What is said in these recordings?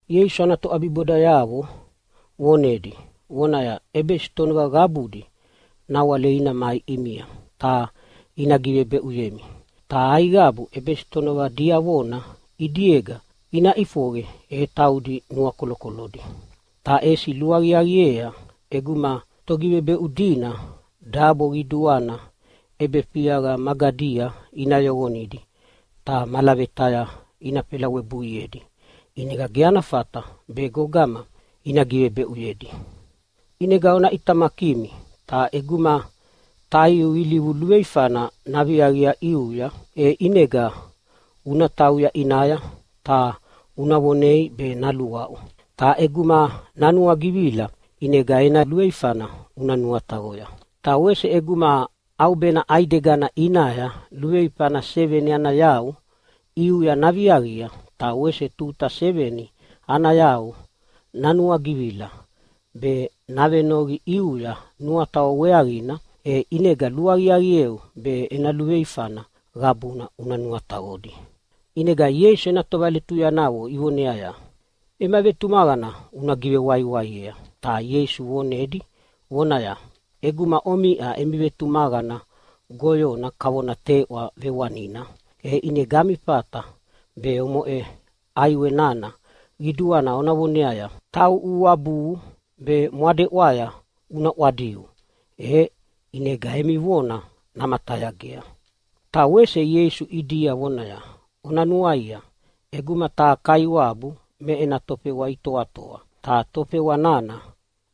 Ieisu ana toʼabibodayavo vonedi vonaya, “ʼEbesitonova qabudi nawale ina mai ʼimia ta ina givebeʼuyemi, ta aiqabu ʼebesitonova diavona ʼidiega ina ʼifoqe e taudi nuakolokolodi. Ta ʼesi luaqiaqiea ʼeguma togivebeʼu dina dabo qiduana ʼebefiaqa magadia ina yoqonidi ta malavetaya ina felawebuiedi ʼinega ge ana fata be gogama ina givebeʼuyedi. “ʼInega ona ʼitamakimi, ta ʼeguma taiu ilivu luveifana naviaqia ʼiuya, e ʼinega una tauya ʼinaya ta una vonei be naluaʼu, ta ʼeguma nanuagivila ʼinega ena luveifana una nuataqoya. Ta wese ʼeguma ʼaubena ʼaidegana ʼinaya luveifana seveni ana yau ʼiuya naviaqia, ta wese tuta seveni ana yau nanuagivila be navenoqi ʼiuya nuataqo weaqina, e ʼinega luaqiaqieu be ena luveifana qabuna una nuataqodi.” ʼInega Ieisu ena tovaletuyanayavo ivoneaya, “Ema vetumaqana una givewaiwaiea.” Ta Ieisu vonedi vonaya, “ʼEguma omiʼa emi vetumaqana goyona kavona teʼwa vewanina, e ʼinega ami fata be omoʼe ʼaiwe nana qiduana ona voneaya, ‘Tauʼu uabuhu be mwadeʼwaya una ʼwadiu!’ E ʼinega emi vona namatayagea.” Ta wese Ieisu ʼidia vonaya, “Ona nuaia, ʼeguma taha kaiwabu me ena tofewa itoatoa ta tofewa nana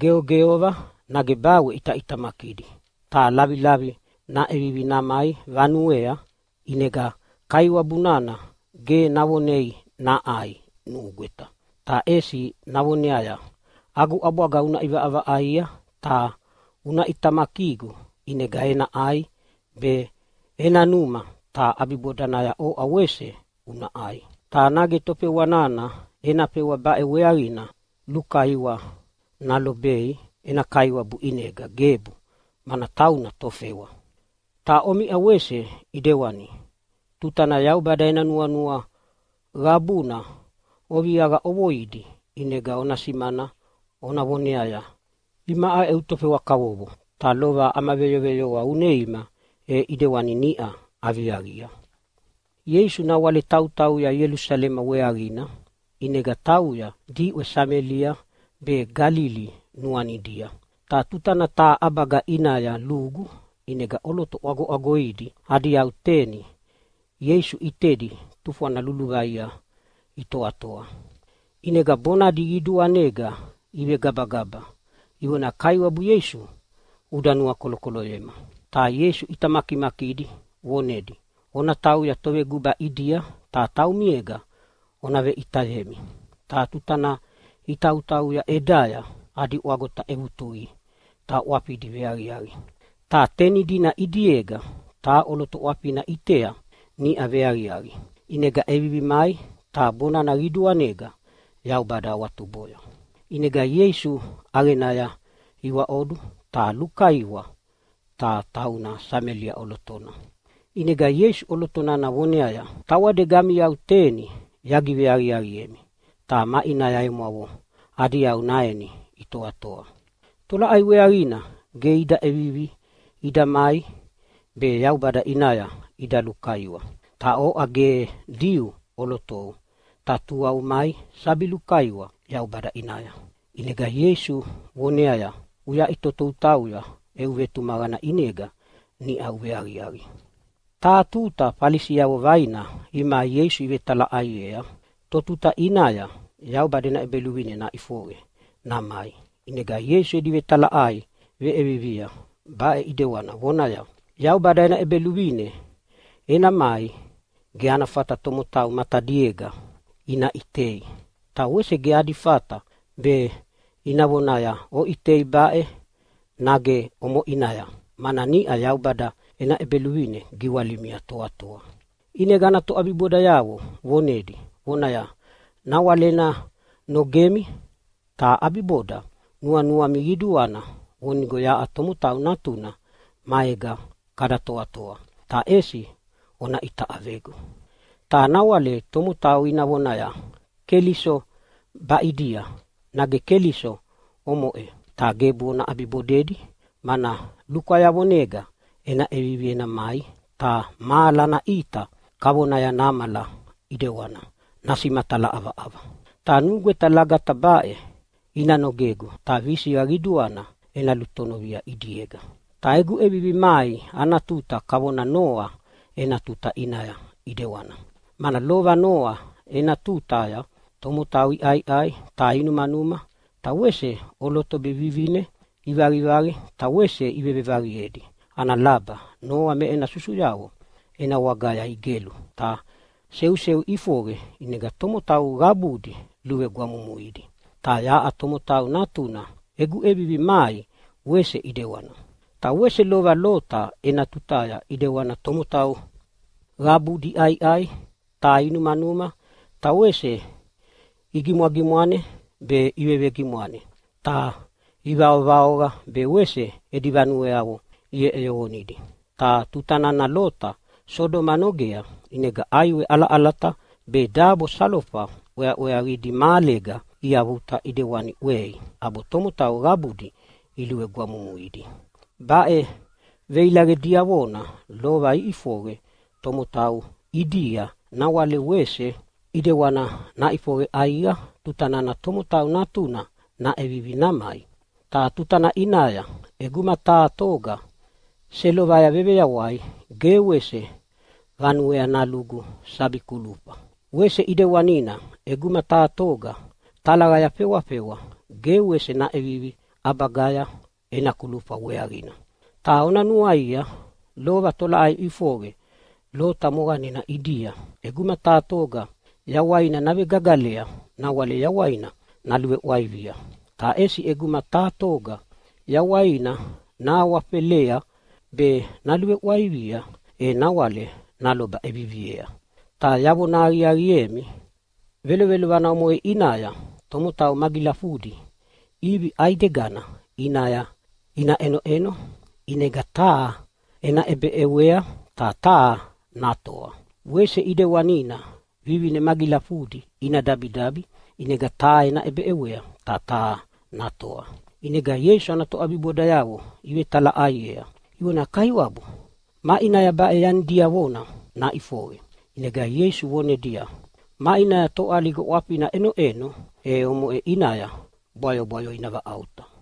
geogeova nage bawe ʼitaʼitamakidi, ta lavilavia naʼevivi namai vanuea, ʼinega kaiwabu nana ge navonei naʼai nugweta, ta ʼesi navoneaya, ‘Agu ʼabwaga una ʼivaʼavaʼaia ta una ʼitamakigu ʼinega ena ʼai be ena numa, ta ʼabibodanaya oʼa wese una ʼai.’ Ta nage tofewa nana ena fewa baʼe weaqina lukaiwa nalobei ena kaiwabu ʼinega? Gebu, mana tauna tofewa. Ta omiʼa wese ʼedewani, tutana Yaubada ena nuanua qabuna oviaqa ʼovoidi ʼinega ona simana ona voneaya, ‘Imaʼa eu tofewa kavovo, ta lova ama veyoveyoa uneima, e ʼidewani niʼa aviaqia.’” Ieisu nawale tautauya Ielusalema weaqina, ʼinega tauya diʼwe Samelia be Galili nuanidia. Ta tutana taha ʼabaga ʼinaya lugu, ʼinega ʼoloto ʼwagoʼwagoidi adi yau teni Ieisu ʼitedi tufwana luluvaia itoatoa. ʼInega bonadi qiduanega ivegabagaba ivonaya, “Kaiwabu Ieisu, uda nuakolokoloyema.” Ta Ieisu ʼita makimakidi vonedia, “Ona tauya toveguba ʼidia ta taumiega ona veʼitayemi!” Ta tuta nana itautauya ʼedaya adi ʼwagota ʼevutuqidi ta ʼwafidi veaqiaqi. Ta teni dina ʼidiega taha ʼoloto ʼwafina ʼitea niʼa veaqiaqi, ʼinega ʼevivi mai ta bonana qiduanega Yaubada awatuboya. ʼInega Ieisu ʼaqenaya iwaʼodu ta lukaiwa. Ta tauna Samelia ʼolotona. ʼInega Ieisu ʼoloto nana voneaya, “Tawadega ami yau teni yagiveaqiaqiemi ta maʼinaya emwavo adi yau naeni itoatoa? Tolaʼai weaqina ge ida ʼevivi ida mai be Yaubada ʼinaya ida lukaiwa? Ta oʼa ge Diu ʼolotou, ta tua umai sabi lukaiwa Yaubada ʼinaya.” ʼInega Ieisu voneaya, “Uyaʼitoto utauya, eu vetumaqana ʼinega niʼa uveaqiaqi.” Taha tuta Falisiavo vaina imai Ieisu ivetalaʼaiea totuta ʼinaya Yaubada ena ʼEbeluvine naʼifoqe namai. ʼInega Ieisu edi vetalaʼai veʼiea baʼe ʼidewana vonaya, “Yaubada ena ʼEbeluvine ena mai ge ana fata tomotau matadiega ina ʼitei. Ta wese ge adi fata be ina vonaya, ‘Oʼitei baʼe!’ nage, ‘Omoʼinaya!’ mana niʼau Yaubada ena ʼEbeluvine giwalimia toatoa.” ʼInega ana toʼabibodayavo vonedi vonaya, “Nawale ena nogemi ta ʼabiboda nuanuami qiduana vonigo yaʼa Tomotau Natuna maega kada toatoa, ta ʼesi ona ʼita ʼavegu. Ta nawale tomotau ina vonaya, ‘Keliso baʼidia!’ nage ‘Keliso omoʼe!’ ta gebu ona ʼabibodedi. Mana lukwayavonega ena ʼevivi ena mai, ta mahala ana ʼita kavonaya namala ʼidewana nasimatala ʼavaʼava. Ta nugweta lagata baʼe ina nogegu, ta visiqa qiduana ena lutonovia ʼidiega. “Ta egu ʼevivi mai ana tuta kavonaya Noa ena tuta ʼinaya ʼedewana. Mana lova Noa ena tutaya tomotau iʼaiʼai ta inumanuma, ta wese ʼoloto be vivine ivaqivaqi ta wese ivevevaqiedi ana laba Noa me ena susuyavo ena wagaya igelu ta seuseu ʼifoqe ʼinega tomotau qabudi luvegwamumuidi. Ta yaʼa Tomotau Natuna egu ʼevivi mai wese ʼedewana. “Ta wese lova Lota ena tutaya ʼedewana, tomotau qabudi iʼaiʼai ta inumanuma ta wese igimwagimwane be ivevegimwane, ta ivaovaoqa be wese edi vanueavo iʼeʼeyoqonidi. Ta tutana Lota Sodoma nogea ʼinega ʼaiwe ʼalaʼalata be dabo salofa ʼweaʼweavidi mahalega iavuta ʼedewani ʼwei, ʼabo tomotau qabudi luvegwamumuidi. Baʼe veilaqe diavona lova iʼifoqe tomotau ʼidia nawale wese ʼedewana naʼifoqe ʼaiqa tutana Tomotau Natuna naʼevivi namai. “Ta tutana ʼinaya ʼeguma taha toga selovaya veveyawai ge wese vanuea nalugu sabi kulufa. Wese ʼidewanina ʼeguma taha toga talaqaya fewafewa ge wese naʼevivi ʼabagaya ena kulufa weaqina. Ta ona nuaia lova tolaʼai ʼifoqe Lota moqanena ʼidia. ʼEguma taha toga yawaina navegagalea nawale yawaina naluveʼwaivia, ta ʼesi ʼeguma taha toga yawaina nahawafelea be naluveʼwaivia e nawale naloba ʼeviviea. Ta yavona aqiaqiemi, velovelovana omoʼe ʼinaya tomotau magilafudi ʼivi ʼaidegana ʼinaya ina ʼenoʼeno, ʼinega taha ena ʼebeʼewea ta taha natoa. Wese ʼedewanina vivine magilafudi ina dabidabi, ʼinega taha ena ʼebeʼewea ta taha natoa.” ʼInega Ieisu ana toʼabibodayavo ivetalaʼaiea ivonaya, “Kaiwabu, maʼinaya baʼe yani diavona naʼifoqe?” ʼInega Ieisu vonedia, “Maʼinaya toʼaliga ʼwafina ʼenoʼeno e omoʼe ʼinaya bwayobwayo ina vaʼauta.”